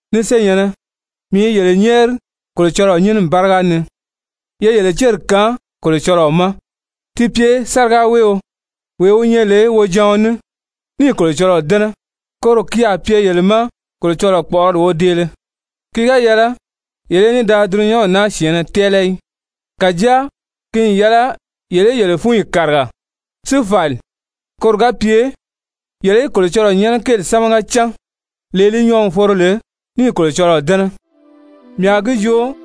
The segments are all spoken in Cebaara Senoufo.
Ni senyɛ̀nnɛ, mii i yele nyɛ́ɛri Kolocɔlɔɔ nyínimi báriga ni, ye yele céri kaan Kolocɔlɔɔ ma ti pye sárigaweeo, wee wi nyɛ lè wojaɔn ní, níì Kolocɔlɔɔ dɛ́nɛ, koro ki a pye yele ma Kolocɔlɔɔ kpɔ̀ʔɔrɔli wodeele. Ki ga yɛlɛ yele í ní da dulunyanw naa syɛ̀ɛnnɛ tɛ́ɛlɛ í, kàjáa ki n yɛlɛ yele í yele fúnyi kàriga si fàli, koro ga pye yele í Kolocɔlɔɔ nyɛ́nɛ kéeli sámaga cán, lee li nyɔɔ n foro lè, níì Kolocɔlɔɔ dɛ́nɛ. Mii a gi joo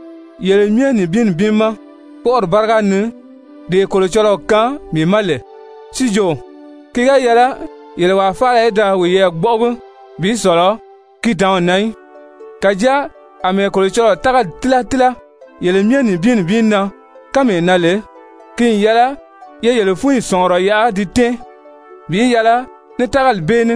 yele myɛ nibin nibin ma kpɔ́ʔɔri báriga ni, dee Kolocɔlɔɔ kaan mii ma lè, si jo ki ga yɛlɛ yele wàa faala í da wiyɛɛ gbɔ́ʔɔgi bi sɔ̀lɔ ki dǎnw na í, kàjáa àmɛɛ Kolocɔlɔɔ tágali tíla tíla yele myɛ nibin nibin na kánmee na lè, ki n yɛlɛ ye yele fúnyi sɔ̀ngurɔ yaʔa di tɛ́ɛn bi yɛlɛ ní tágali bee ní.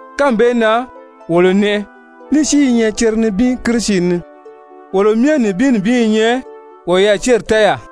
kánmi bee na wolo nɛʔɛ, ní si i nyɛ cere nibin Kirisi ni, wolo myɛ nibin nibin i nyɛ woyɛɛ céri tɛ́ɛyaa.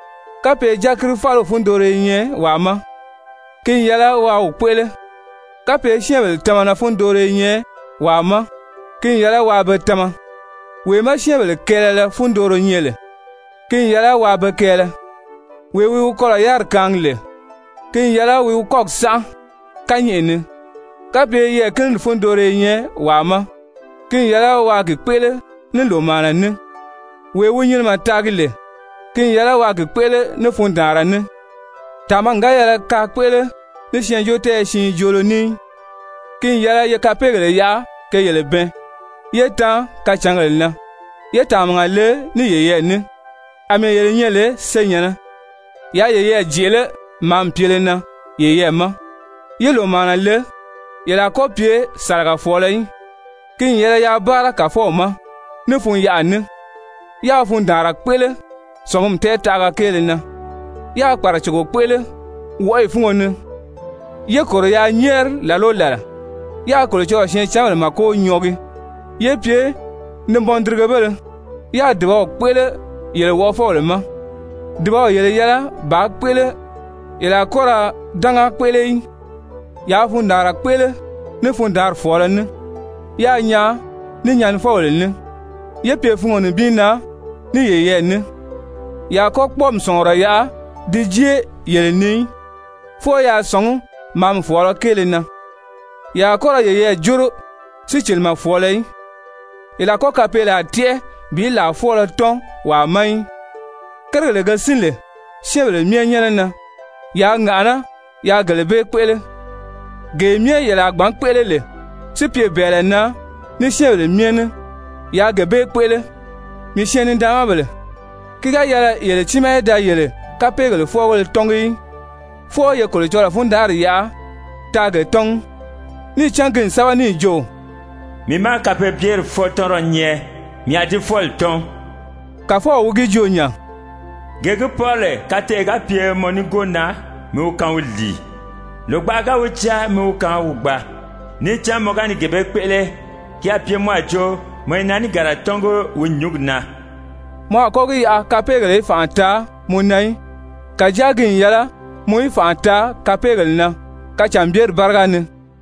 Kapye dyakiri fáliw fundooro i nyɛ wàa ma, ki n yɛlɛ waa wi kpéʔele. Kapye syɛ́ɛnbèle tamana fundooro i nyɛ wàa ma, ki n yɛlɛ waa be tama. Wee má syɛ́ɛnbèle kɛɛlɛlɛ fundooro nyɛ lè, ki n yɛlɛ waa be kɛɛlɛ. Wee wi wi kɔlɔ̀ yáriri kaangi lè, ki n yɛlɛ wi wi kɔ́gi sánʔa kányɛʔɛ ni. Kapye yɛɛ̀kinidi fundooro i nyɛ wàa ma, ki n yɛlɛ waa gi kpéʔele ní lòmaana ní. Wee wi nyinimɛ taagi lè, ki n yɛlɛ waa gi kpéʔele ní fundaanra ní. Tàmagi ga yɛlɛ kaa kpéʔele ní syɛɛnjóotɛɛyɛ siin joolo ní í. Ki n yɛlɛ ye kapeegèle yaʔa ke yele bɛɛn yé tan kacǎngèle na. Ye tàmaga le ní yeyɛɛ ní àmɛɛ yele nyɛ lè senyɛ̀nnɛ. Yaa yeyɛɛ jèʔelé màámi pyele na yeyɛɛ ma. Ye lòmaana le, yele a kɔ́ pye sàlagafɔɔlɔ í. Ki n yɛlɛ yaa báara Kàfɔw ma ní fun-yaʔa ní. Yaa fundaanra kpéʔele sɔ̀ngumi tɛɛtaʔaga kéele na, yáā kpàracogo kpéʔele wɔʔɔyi fúngo ni, yé kòro yaa nyɛ́ɛri làla o làla. Yaa Kolocɔlɔɔ syɛɛncanbèle màko nyɔɔgi, yé pye nibɔndirigebéle. Yaa dùbaw kpéʔele yele wɔʔɔfɔbèle ma. Dùbaw yele yɛlɛ bàā kpéʔele, ye a kɔ́ ra dánga kpéʔele í! Yaa fundaanra kpéʔele ní fundaanri fɔ̀ɔlɔ ní, yáā nyaan ní nyɛnifɔbèle ní. Ye pye fungo nibin na ní yeyɛɛ ní. Yele a kɔ́ kpɔ́ɔmi sɔ̀ngurɔ yaʔa di jée yele ni í, fwɔɔ yaa sɔ̀ngí màámi fɔ̀ɔlɔ kéele na. Yele a kɔ́ ra yeyɛɛ jóro sícilimɛ fɔ̀ɔlɔ í. Yele a kɔ́ kapeelaa tɛ́ʔɛ bi làa fwɔ́ɔlɔ tɔ́n wàa ma í. Kérigèle ge sín lè syɛ́ɛnbèle myɛ nyɛ́nɛ na, yaa ŋàʔaná yaa gele bee kpéʔele. Gee myɛ yele a gbǎn kpéʔele lè si pye bɛ̀ɛlɛ na ní syɛ́ɛnbèle myɛ ní, yaa gee bee kpéʔele. Mii syɛɛn-nidaanmabèle, ki ga yɛlɛ yele tiimaa í da yele kapeegèle fwɔ́ɔgéle tɔ́ngi í, fwɔɔ ye Kolocɔlɔɔ fundanʔari yaʔa taa ge tɔ́ngi, níì cán ki n sɛ́bɛ níì jo: «Mii má kapeebyeri fwɔ́ɔtɔnrɔ nyɛ, mii a di fwɔ́ɔli tɔ́n,» Kàfɔw wi gi joo nya. «Gee gi pɔ́rɔ lè kateʔe ga pye mɔ nígoo na, mi wi kaan wi lìi. Lògbaʔa ga wi jáa, mi wi kaan wi gbaa. Níì cán mɔ ga ni gee bee kpéʔele, ki a pye mɔ a jo mɔ i naàniganra tɔ́ngi wi nyúngi na.» Mɔ a kɔ́ gi yaʔa kapeegèle í fànʔa taa mɔ na í, kàjáa ki n yɛlɛ mɔ í fànʔa taa kapeegèle na kacànbyeri báriga ni.